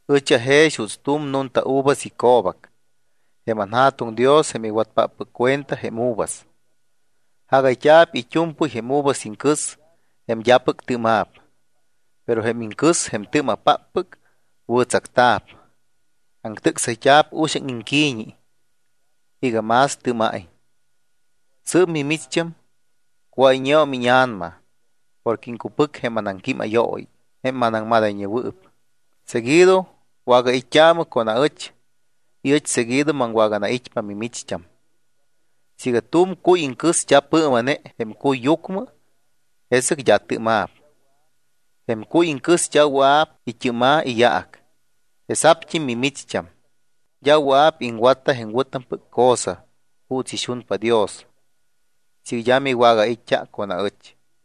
’Ɨch ajex juuts tu̱m nunta uvas ico̱bac. Jém anJa̱tuŋ Dios jém iwatpáppɨc cuenta jém uvas. Jagayt́a̱p it́u̱mpɨy jém uvas iŋcɨs jém d́apɨc tɨ́ma̱p. Pero jém iŋcɨs jém tɨ́ma̱páppɨc, wɨ̱tsacta̱p, aŋtɨ́csayt́a̱p uxaŋ iŋqui̱ñi iga más tɨ́ma̱iñ. Sɨɨp mimicht́am cuáyñeum íña̱nama porque iŋcupɨc jém anaŋquímayooyi, jém manaŋmadayñewɨɨp. Seguido wagait́t́aamɨ con aɨch y ɨch seguido maŋwaganait́pa mimicht́am. Siiga tu̱m cuy iŋcɨs d́a pɨɨma̱ne jém cuyyucmɨ, jesɨc d́a tɨ́ma̱p. Jém cuy iŋcɨs d́a wɨa̱p it́ɨ́ma̱ iyaac. Jesa̱pt́im mimicht́am d́a wɨa̱p iŋwatta jém wɨ̱tampɨc cosa juuts ixunpa Dios siiga d́a miwagait́t́a con aɨch.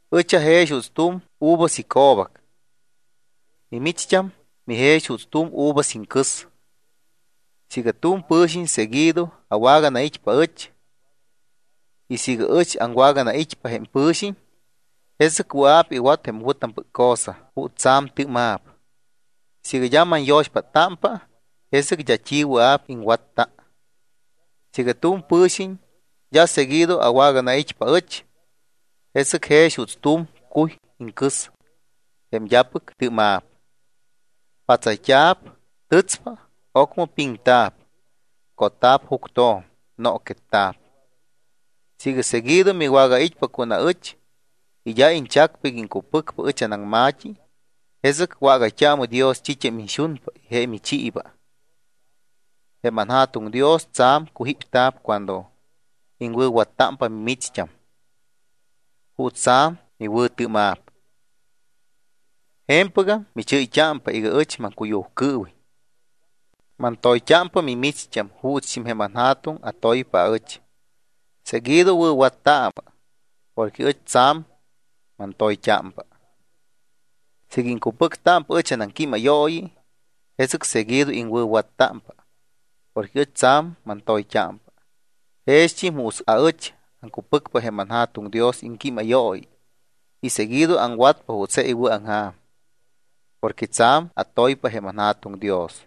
’Ɨch ajex juuts tu̱m uvas ico̱bac. Mimicht́am mijex juuts tu̱m uvas iŋcɨs. Siiga tu̱m pɨ̱xiñ seguido awaganait́pa aɨch y siiga ɨch aŋwaganait́pa jém pɨ̱xiñ, jesɨc wɨa̱p iwat jém wɨ̱tampɨc cosa juuts tsa̱m tɨ́ma̱p. Siiga d́a manyo̱xpáttámpa, jesɨc d́a t́i wɨa̱p iŋwatta. Siiga tu̱m pɨ̱xiñ d́a seguido awaganait́pa aɨch, jesɨc jex juuts tu̱m cuy iŋcɨs jém d́apɨc tɨ́ma̱p. Pátsayt́a̱p, tɨtspa. Ocmɨ piŋta̱p, cotta̱p juctjo̱m, nooquetta̱p. ’Siiga seguido miwagait́pa con aɨch y d́a iñchacpa iga iŋcupɨcpa ɨch anaŋma̱t́i, jesɨc wágayt́aamɨ Dios t́it́am iñxunpa y je michiiba. Jém anJa̱tuŋ Dios tsa̱m cujípta̱p cuando iŋwɨ̱wattámpa mimicht́am, juuts tsa̱m miwɨ̱tɨ́ma̱p. Je̱mpɨgam michɨ́yt́ámpa iga ɨch maŋcuyujcɨɨwiñ. Mantoyt́ámpa mimicht́am juutst́im jém anJa̱tuŋ atoypa aɨch. Seguido wɨ̱wattaamɨ porque ɨch tsa̱m mantoyt́ámpa. Siiga iŋcupɨctámpa ɨch anaŋquímayooyi, jesɨc seguido iŋwɨ̱wattámpa porque ɨch tsa̱m mantoyt́ámpa. Jext́im juuts aɨch aŋcupɨcpa jém anJa̱tuŋ Dios iŋquímayooyi y seguido aŋwatpa juuts je iwɨ̱aŋja̱m porque tsa̱m atoypa jém anJa̱tuŋ Dios.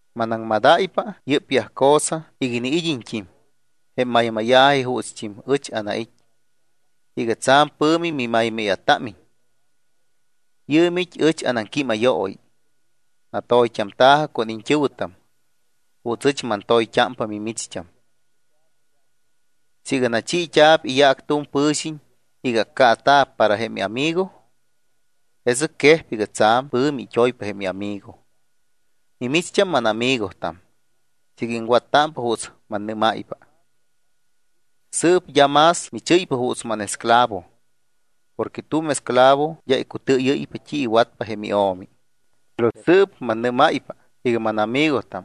’Manaŋmadáypa yɨ́pyaj cosa iga iniid́iñt́im jém maymáya̱ji juutst́im ɨch anait́, iga tsa̱m pɨ̱mi mimaymáya̱támiñ. Yɨɨm it́ ɨch anaŋquímayooyi: Natoyt́amta̱jɨ con iñt́ɨ̱wɨtam juuts ɨch mantoyt́ámpa mimicht́am. Siiga nachiit́a̱p iyaac tu̱m pɨ̱xiñ iga accaata̱p para jém iamigo, jesɨc quejpa iga tsa̱m pɨ̱mi it́oypa jém iamigo. Mimicht́am mánamigotam siiga iŋwattámpa juuts mannɨ́máypa. Sɨɨp d́am más michɨ́ypa juuts mánesclavo porque tu̱m esclavo d́a icutɨɨyɨ́ypa t́i iwatpa jém io̱mi. Pero sɨɨp mannɨ́máypa iga mánamigotam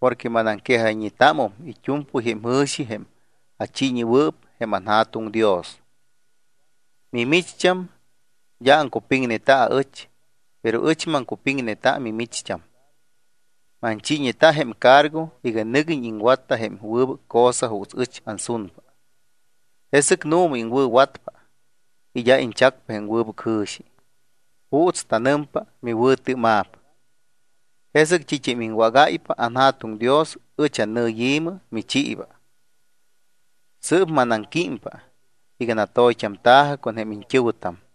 porque manaŋquejayñetámum it́u̱mpɨy jém jɨ̱xi jém achiiñewɨɨp jém anJa̱tuŋ Dios. Mimicht́am d́a aŋcupiŋneta aɨch, pero ɨch maŋcupiŋneta mimicht́am. Manchiiñeta jém cargo iga nɨguiñ iŋwatta jém wɨbɨc cosa juuts ɨch ansunpa. Jesɨc nu̱ma iŋwɨ̱watpa y d́a iñchacpa jém wɨbɨc jɨ̱xi, juuts tanɨmpa, miwɨ̱tɨ́ma̱p. Jesɨc t́it́am iŋwágáypa anJa̱tuŋ Dios, ɨch annɨyi̱mɨ, michiiba. Sɨɨp manaŋquímpa iga natoyt́amta̱jɨ con jém iñt́ɨ̱wɨtam.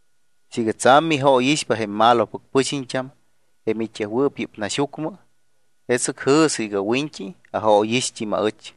’Siiga tsa̱m mijóyixpa jém malopɨc pɨxiñt́am jém it́yajwɨɨp yɨ́p naxyucmɨ, jesɨc jɨ̱sɨ iga wiñt́i ajóyixt́im aɨch.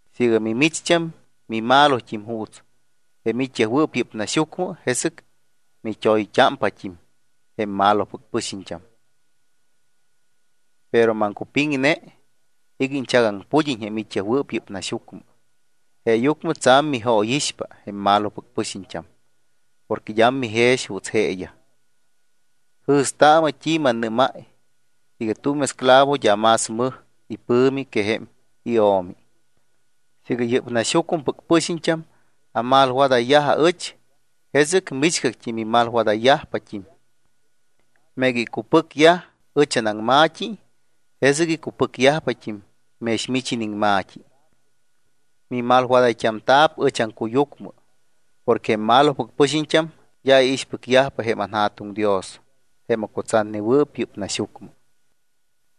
Siiga mimicht́am mimalot́im juuts jém it́yajwɨɨp yɨ́p naxyucmɨ, jesɨc mit́oyt́ámpat́im jém malopɨc pɨxiñt́am. Pero maŋcupiŋne iga iñchagaŋpudiñ jém it́yajwɨɨp yɨ́p naxyucmɨ. Jeeyucmɨ tsa̱m mijóyixpa jém malopɨc pɨxiñt́am porque d́am mijex juuts jeeyaj. Jɨ̱staamɨ t́i mannɨ́máy iga tu̱m esclavo d́a más mɨj ipɨ̱mi que jém io̱mi. Siiga yɨ́p naxyucmɨpɨc pɨxiñt́am amalwadayyaj aɨch, jesɨc michgact́i mimalwadayyajpat́im. Meega icupɨcyaj ɨch anaŋma̱t́i, jesɨc icupɨcyajpat́im mex mich iniŋma̱t́i. Mimalwadayt́amta̱p ɨch aŋcuyucmɨ porque jém malopɨc pɨxiñt́am d́a iixpɨcyajpa jém anJa̱tuŋ Dios jém acutsatnewɨɨp yɨ́p naxyucmɨ.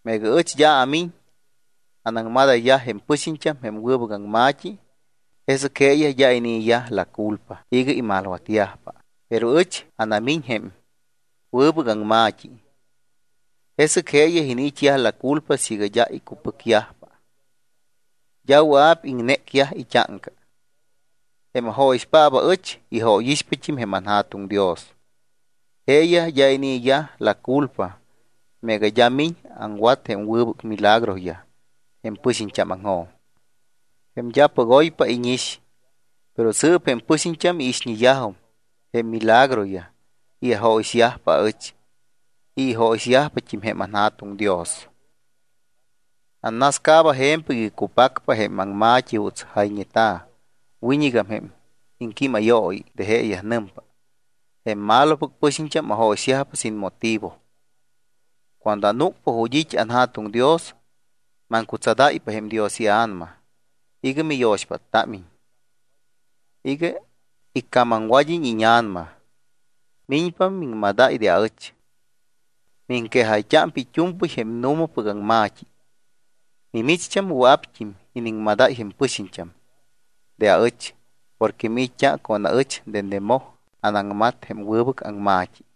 ’Meega ɨch d́a miñ anaŋmadayyaj jém pɨxiñt́am jém wɨbɨc aŋma̱t́i, jesɨc jeeyaj d́a inii̱yaj la culpa iga imalwatyajpa. Pero ɨch anamíñáy jém wɨbɨc aŋma̱t́i, jesɨc jeeyaj iniit́yaj la culpa siiga d́a icupɨcyajpa, d́a wɨa̱p iŋnécyaj it́áŋca. Jém ajóyixpáppɨc aɨch, ijóyixpat́im jém anJa̱tuŋ Dios. Jeeyaj d́a inii̱yaj la culpa meega d́a miñ aŋwat jém wɨbɨc milagroyaj jém pɨxiñt́ámaŋjo̱m, jém d́apɨc oypa íñix. Pero sɨɨp jém pɨxiñt́am iixñeyajum jém milagroyaj y ajóyixyajpa aɨch y ijóyixyajpat́im jém anJa̱tuŋ Dios. Annascaaba je̱mpɨc iga cupacpa jém aŋma̱t́i juuts jayñeta̱ wiñɨgam jém iŋquímayooyi de jeeyaj. Nɨmpa: “Jém malopɨc pɨxiñt́am ajóyixyajpa sin motivo.” ’Cuando anúcpa ju̱t́ it́ anJa̱tuŋ Dios, maŋcutsadáypa jém Dios iA̱nama iga miyo̱xpáttámiñ, iga icamamwad́iñ íña̱nama. Miñpa miŋmadáy de aɨch. Miŋquejayt́ámpa it́u̱mpɨy jém nu̱mapɨc aŋma̱t́i. Mimicht́am wɨa̱pt́im iniŋmadáy jém pɨxiñt́am de aɨch porque miit́t́a con aɨch dende moj anaŋmat jém wɨbɨc aŋma̱t́i.